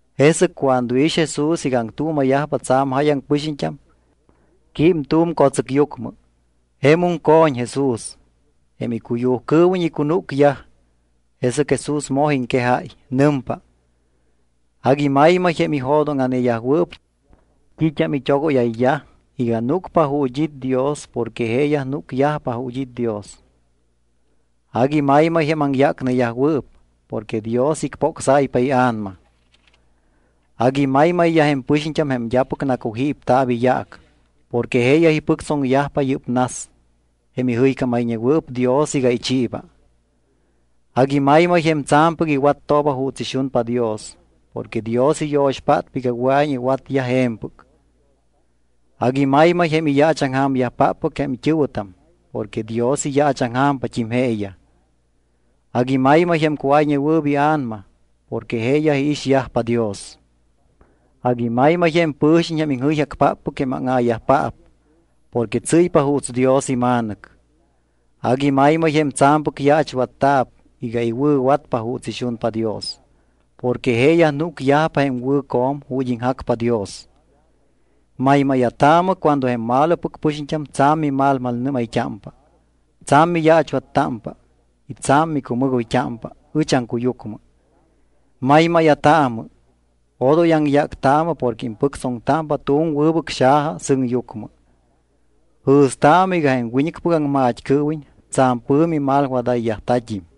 Jesɨc cuando iix Jesús iga aŋtuuma̱yajpa tsa̱m jáyaŋ pɨxiñt́am, quím tu̱m co̱tsɨcyucmɨ. Jemum co̱ñ Jesús. Jém icuyujcɨɨwiñ icunúcyaj. Jesɨc Jesús moj iŋquejáy. Nɨmpa: —Agui maymay jém ijo̱dóŋa̱neyajwɨɨp t́it́am it́ogóyayyaj iga núcpa ju̱t́ it́ Dios porque jeeyaj núcyajpa ju̱t́ it́ Dios. ’Agui maymay jém aŋyácneyajwɨɨp porque Dios icpocsáypa ia̱nama. ’Agui maymayyaj jém pɨxiñt́am jém d́apɨc nacujípta̱p iyaac porque jeeyaj ipɨctsoŋyajpa yɨ́p nas, jém ijɨycámayñewɨɨp Dios iga ichiiba. ’Agui maymay jém tsa̱mpɨc iwattooba juuts ixunpa Dios porque Dios iyo̱xpátpa iga wɨa̱iñ iwatyaj je̱mpɨc. ’Agui maymay jém iyaachaŋja̱myajpáppɨc jém it́ɨ̱wɨtam porque Dios iyaachaŋja̱mpat́im jeeyaj. ’Agui maymay jém cuáyñewɨɨp ia̱nama porque jeeyaj iixyajpa Dios. ’Agui maymay jém pɨ̱xiñ jém iŋjɨyjacpáppɨc jém áŋa̱yajpaap porque tsɨ́ypa juuts Dios ima̱nɨc. ’Agui maymay jém tsa̱mpɨc yaachwatta̱p iga iwɨ̱watpa juuts ixunpa Dios porque jeeyaj núcyajpa jém wɨ̱co̱m ju̱t́ iŋjacpa Dios. ’Maymáya̱taamɨ cuando jém malopɨc pɨxiñt́am tsa̱m mimalnɨ́mayt́ámpa, tsa̱m miyaachwattámpa y tsa̱m micumɨgoyt́ámpa ɨch aŋcuyucmɨ. Maymáya̱taamɨ. Odoy aŋyáctaamɨ porque impɨctsoŋtámpa tu̱m wɨbɨc xaja sɨŋyucmɨ. Jɨ̱staamɨ iga jém wiñɨcpɨc aŋmat́cɨɨwiñ tsa̱m pɨ̱mi malwadayyajta̱t́im.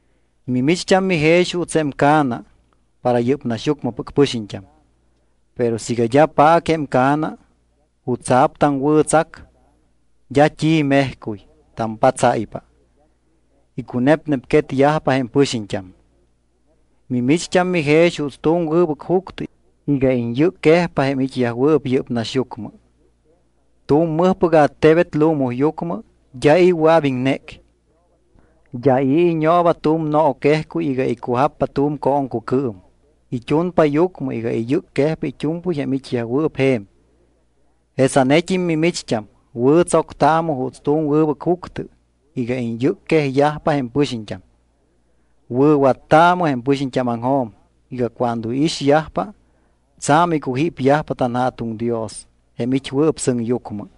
’Mimicht́am mijex juuts jém ca̱na para yɨ́p naxyucmɨpɨc pɨxiñt́am. Pero siiga d́a paac jém ca̱na, ¿jutsa̱p taŋwɨ̱tsac? D́a t́i mejcuy. Tampatsáypa. Icunepnepquetyajpa jém pɨxiñt́am. ’Mimicht́am mijex juuts tu̱m wɨbɨc juctɨ iga iñyɨcquejpa jém it́yajwɨɨp yɨ́p naxyucmɨ. Tu̱m mɨjpɨc attebet lumuyucmɨ d́a i̱ wɨa̱p iŋnéc. D́a i̱ iñooba tu̱m nooquejcuy iga icujappa tu̱m cooŋcucɨɨm. It́unpa yucmɨ iga iyɨcquejpa it́u̱mpɨy jém it́yajwɨɨp je̱m. Jesanet́im mimicht́am wɨ̱tsoctaamɨ juuts tu̱m wɨbɨc juctɨ iga iñyɨcquejyajpa jém pɨxiñt́am. Wɨ̱wattaamɨ jém pɨxiñt́ámaŋjo̱m iga cuando iixyajpa, tsa̱m icujípyajpa tanJa̱tuŋ Dios jém it́wɨɨp sɨŋyucmɨ.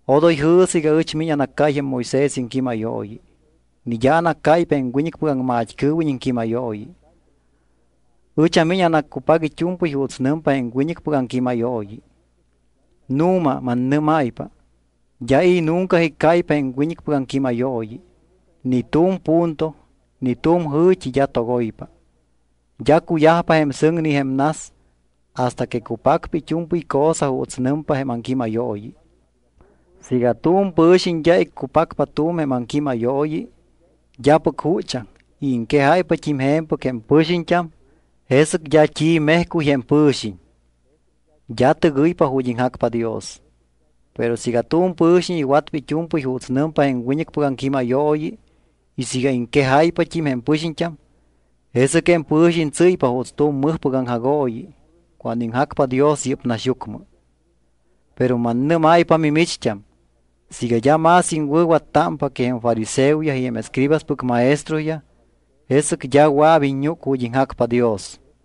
’Odoy jɨ̱sɨ iga ɨch miñ anaccáy jém Moisés iŋquímayooyi, ni d́a anaccáypa jém wiñɨcpɨc aŋmat́cɨɨwiñ iŋquímayooyi. Ɨch amiñ anaccupac it́u̱mpɨy juuts nɨmpa jém wiñɨcpɨc aŋquímayooyi. Nu̱ma, mannɨ́máypa, d́a i̱ nunca iccáypa jém wiñɨcpɨc aŋquímayooyi. Ni tu̱m punto ni tu̱m jɨ̱t́i d́a togoypa. D́a cuyajpa jém sɨŋ ni jém nas hasta que cupacpa it́u̱mpɨy cosa juuts nɨmpa jém aŋquímayooyi. Siiga tu̱m pɨ̱xiñ d́a iccupacpa tu̱m jém aŋquímayooyi d́apɨc juchaŋ y iŋquejáypat́im je̱mpɨc jém pɨxiñt́am, jesɨc d́a t́i mejcuy jém pɨ̱xiñ. D́a tɨgɨypa ju̱t́ iŋjacpa Dios. Pero siiga tu̱m pɨ̱xiñ iwatpa it́u̱mpɨy juuts nɨmpa jém wiñɨcpɨc aŋquímayooyi, y siiga iŋquejáypat́im jém pɨxiñt́am, jesɨc jém pɨ̱xiñ tsɨ́ypa juuts tu̱m mɨjpɨc aŋjagooyi cuando iŋjacpa Dios yɨ́p naxyucmɨ. Pero mannɨ́máypa mimicht́am, siiga d́a más iŋwɨ̱wattámpa que jém fariseoyaj y jém escribaspɨc maestroyaj, jesɨc d́a wɨa̱p iññúc ju̱t́ iŋjacpa Dios.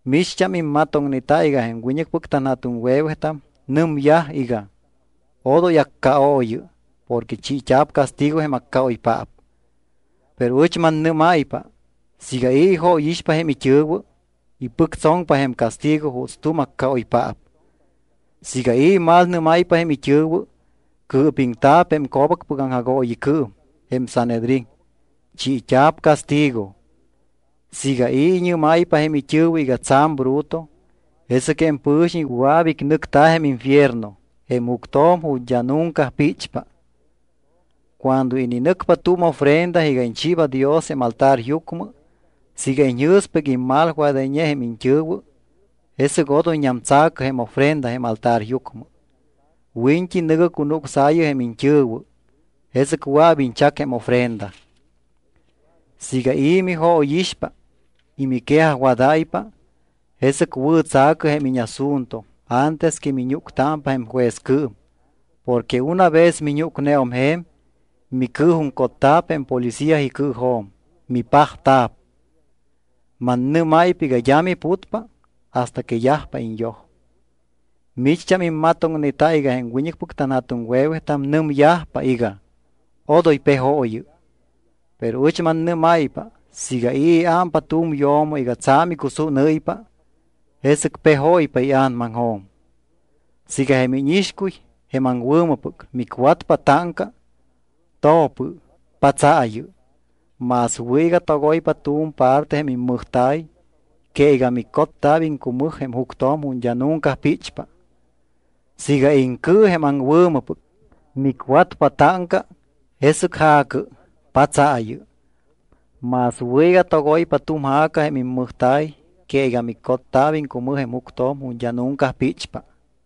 ’Micht́am immatoŋneta iga jém wiñɨcpɨc tanja̱tuŋwe̱wetam nɨmyaj iga: “Odoy accaooyɨ porque chiit́a̱p castigo jém accaoypaap.” Pero ɨch mannɨ́máypa, siiga i̱ ijóyixpa jém it́ɨ̱wɨ, ipɨctsoŋpa jém castigo juuts tu̱m accaoypaap. Siiga i̱ imalnɨ́máypa jém it́ɨ̱wɨ, cɨɨpiŋta̱p jém co̱bacpɨc aŋjagooyicɨɨm, jém Sanhedrín; chiit́a̱p castigo. Siiga i̱ iñɨ́máypa jém it́ɨ̱wɨ iga tsa̱m bruto, jesɨc jém pɨ̱xiñ wɨa̱p icnɨcta̱ jém infierno, jém juctjo̱m ju̱t́ d́a nunca píchpa. ’Cuando ininɨcpa tu̱m ofrenda iga iñchiiba Dios jém altaryucmɨ, siiga iñjɨ̱spa iga immalwadayñe jém iñt́ɨ̱wɨ, jesɨc odoyñam tsa̱cɨ jém ofrenda jém altaryucmɨ. Wiñt́i nɨ̱gɨ cunucsaayɨ jém iñt́ɨ̱wɨ, jesɨc wɨa̱p iñchac jém ofrenda. ’Siiga i̱ mijóyixpa y miquejajwadáypa, jesɨc wɨ̱tsa̱cɨ jém íñasunto antes que miñúctámpa jém juezcɨɨm porque una vez miñúcneum je̱m, micɨɨjuŋcotta̱p jém policía icɨɨjo̱m, mipajta̱p. Mannɨ́máypa iga d́a miputpa hasta que yajpa iñyoj. ’Micht́am immatoŋneta iga jém wiñɨcpɨc tanja̱tuŋwe̱wetam nɨmyajpa iga: “Odoy pejooyɨ.” Pero ɨch mannɨ́máypa siiga i̱ iámpa tu̱m yo̱mo iga tsa̱m icusúnɨ́ypa, jesɨc pejóypa ia̱namaŋjo̱m. ’Siiga jém íñixcuy, jém aŋwɨ̱mɨpɨc, micwatpa táŋca, to̱pɨ, patsaayɨ. Más wɨ̱ iga togoypa tu̱m parte jém immɨjta̱y que iga micotta̱p iŋcumɨj jém juctjo̱m ju̱t́ d́a nunca píchpa. Siiga iŋcɨ, jém aŋwɨ̱mɨpɨc, micwatpa táŋca, jesɨc ja̱cɨ, patsaayɨ. Más wɨ̱ iga togoypa tu̱m ja̱ca jém immɨjta̱y que iga micotta̱p iŋcumɨj jém juctjo̱m ju̱t́ d́a nunca píchpa.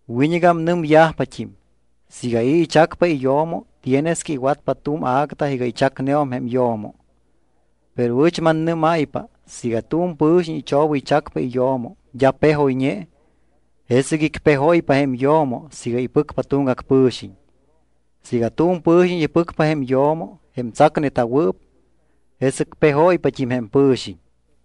’Wiñɨgam nɨmyajpat́im: “Siiga i̱ ichacpa iyo̱mo, tienes que iwatpa tu̱m acta iga ichacneum jém yo̱mo.” Pero ɨch mannɨ́máypa siiga tu̱m pɨ̱xiñ ichobɨychacpa iyo̱mo d́a pejoyñe, jesɨc icpejóypa jém yo̱mo siiga ipɨcpa tuŋgac pɨ̱xiñ. Siiga tu̱m pɨ̱xiñ ipɨcpa jém yo̱mo jém tsacneta̱wɨɨp, jesɨc pejóypat́im jém pɨ̱xiñ.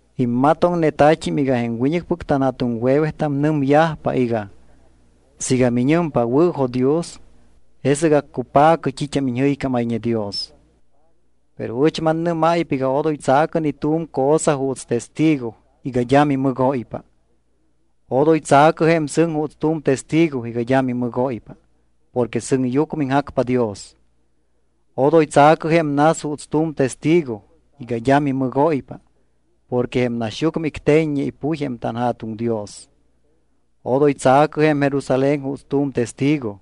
’Immatoŋnetat́im iga jém wiñɨcpɨc tanja̱tuŋwe̱wetam nɨmyajpa iga: “Siiga miñɨmpa, wɨ̱jo̱dios, jesɨc accupa̱cɨ t́it́am iñjɨycámayñe Dios.” Pero ɨch mannɨ́máypa iga odoy tsa̱cɨ ni tu̱m cosa juuts testigo iga d́a mimɨgóypa. Odoy tsa̱cɨ jém sɨŋ juuts tu̱m testigo iga d́a mimɨgóypa porque sɨŋyucmɨ iŋjacpa Dios. Odoy tsa̱cɨ jém nas juuts tu̱m testigo iga d́a mimɨgóypa porque jém naxyucmɨ icte̱ññe ipuy jém tanJa̱tuŋ Dios. Odoy tsa̱cɨ jém Jerusalén juuts tu̱m testigo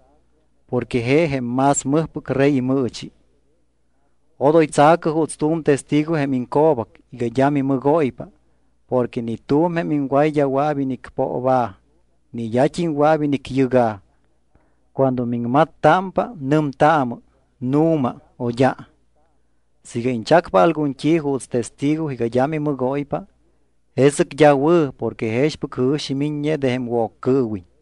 porque je jém más Mɨjpɨc Rey imɨɨchi. Odoy tsa̱cɨ juuts tu̱m testigo jém iŋco̱bac iga d́a mimɨgóypa porque ni tu̱m jém iŋway d́a wɨa̱p inicpooba̱ ni d́at́im wɨa̱p inicyɨga̱. Cuando miŋmattámpa, nɨmtaamɨ “nu̱ma” o “d́a”. Siiga iñchacpa algun t́i juuts testigo iga d́a mimɨgóypa, jesɨc d́a wɨ̱ porque jexpɨc jɨ̱xi miññe de jém Woccɨɨwiñ.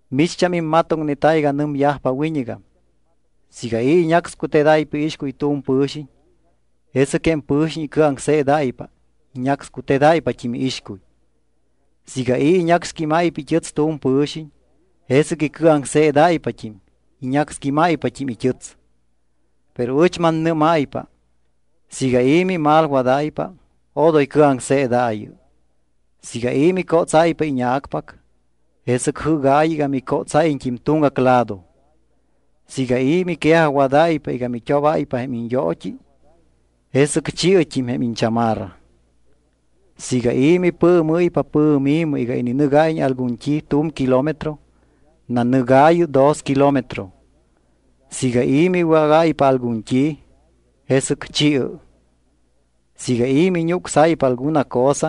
’Micht́am immatoŋneta iga nɨmyajpa wiñɨgam: “Siiga i̱ iñácscutedáypa iixcuy tu̱m pɨ̱xiñ, jesɨc jém pɨ̱xiñ icɨaŋseedáypa, iñácscutedáypat́im iixcuy. Siiga i̱ iñacxquímáypa it́ɨts tu̱m pɨ̱xiñ, jesɨc icɨaŋseedáypat́im, iñacxquímáypat́im it́ɨts.” Pero ɨch mannɨ́máypa: Siiga i̱ mimalwadáypa, odoy cɨaŋseedaayɨ. Siiga i̱ micótsáypa íña̱cpac, jesɨc jɨ́gaayɨ iga micótsáyiñt́im tuŋgac lado. Siiga i̱ miquejajwadáypa iga mit́obáypa jém iñyoot́i, jesɨc chi̱ɨt́im jém iñchamarra. Siiga i̱ mipɨɨmɨ́ypa pɨ̱mi̱mɨ iga ininɨgáyiñ algun t́i tu̱m kilómetro, nanɨgaayɨ dos kilómetro. Siiga i̱ miwágáypa algun t́i, jesɨc chi̱ɨ. Siiga i̱ miñucsáypa alguna cosa,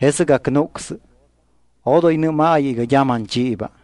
jesɨc acnúcsɨ, odoy nɨ́maayɨ iga d́a manchiiba.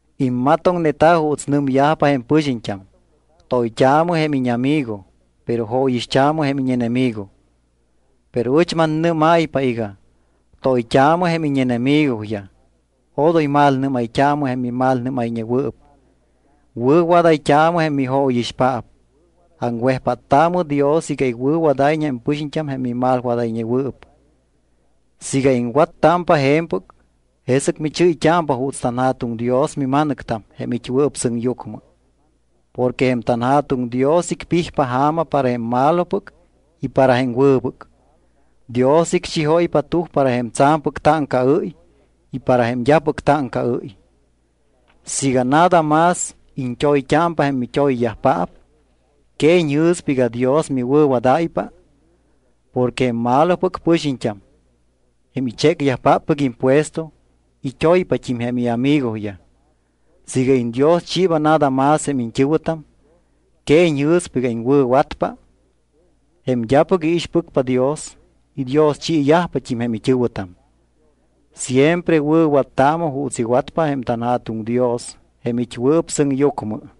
’Immatoŋneta juuts nɨmyajpa jém pɨxiñt́am: “Toyt́aamɨ jém íñamigo, pero jóyixt́aamɨ jém íñenemigo.” Pero ɨch mannɨ́máypa iga: Toyt́aamɨ jém íñenemigoyaj. Odoy malnɨ́mayt́aamɨ jém mimalnɨ́mayñewɨɨp. Wɨ̱wadayt́aamɨ jém mijóyixpaap. Aŋwejpáttaamɨ Dios iga iwɨ̱wadáyiñ jém pɨxiñt́am jém mimalwadayñewɨɨp. Siiga iŋwattámpa je̱mpɨc, jesɨc michɨ́yt́ámpa juuts tanJa̱tuŋ Dios mima̱nɨctam jém it́wɨɨp sɨŋyucmɨ. Porque jém tanJa̱tuŋ Dios icpijpa ja̱ma para jém malopɨc y para jém wɨbɨc. Dios icchijóypa tuj para jém tsa̱mpɨc táŋcaɨ́y y para jém d́apɨc táŋcaɨ́y. Siiga nada más iñt́oyt́ámpa jém mit́oyyajpaap, ¿que iñjɨ̱spa iga Dios miwɨ̱wadáypa? Porque jém malopɨc pɨxiñt́am, jém ichécyajpáppɨc impuesto, it́oypat́im jém iamigoyaj. Siiga iñdioschiiba nada más jém iñt́ɨ̱wɨtam, ¿que iñjɨ̱spa iga iŋwɨ̱watpa? Jém d́apɨc iixpɨcpa Dios idioschiyajpat́im jém it́ɨ̱wɨtam. Siempre wɨ̱wattaamɨ juuts iwatpa jém tanJa̱tuŋ Dios jém it́wɨɨp sɨŋyucmɨ.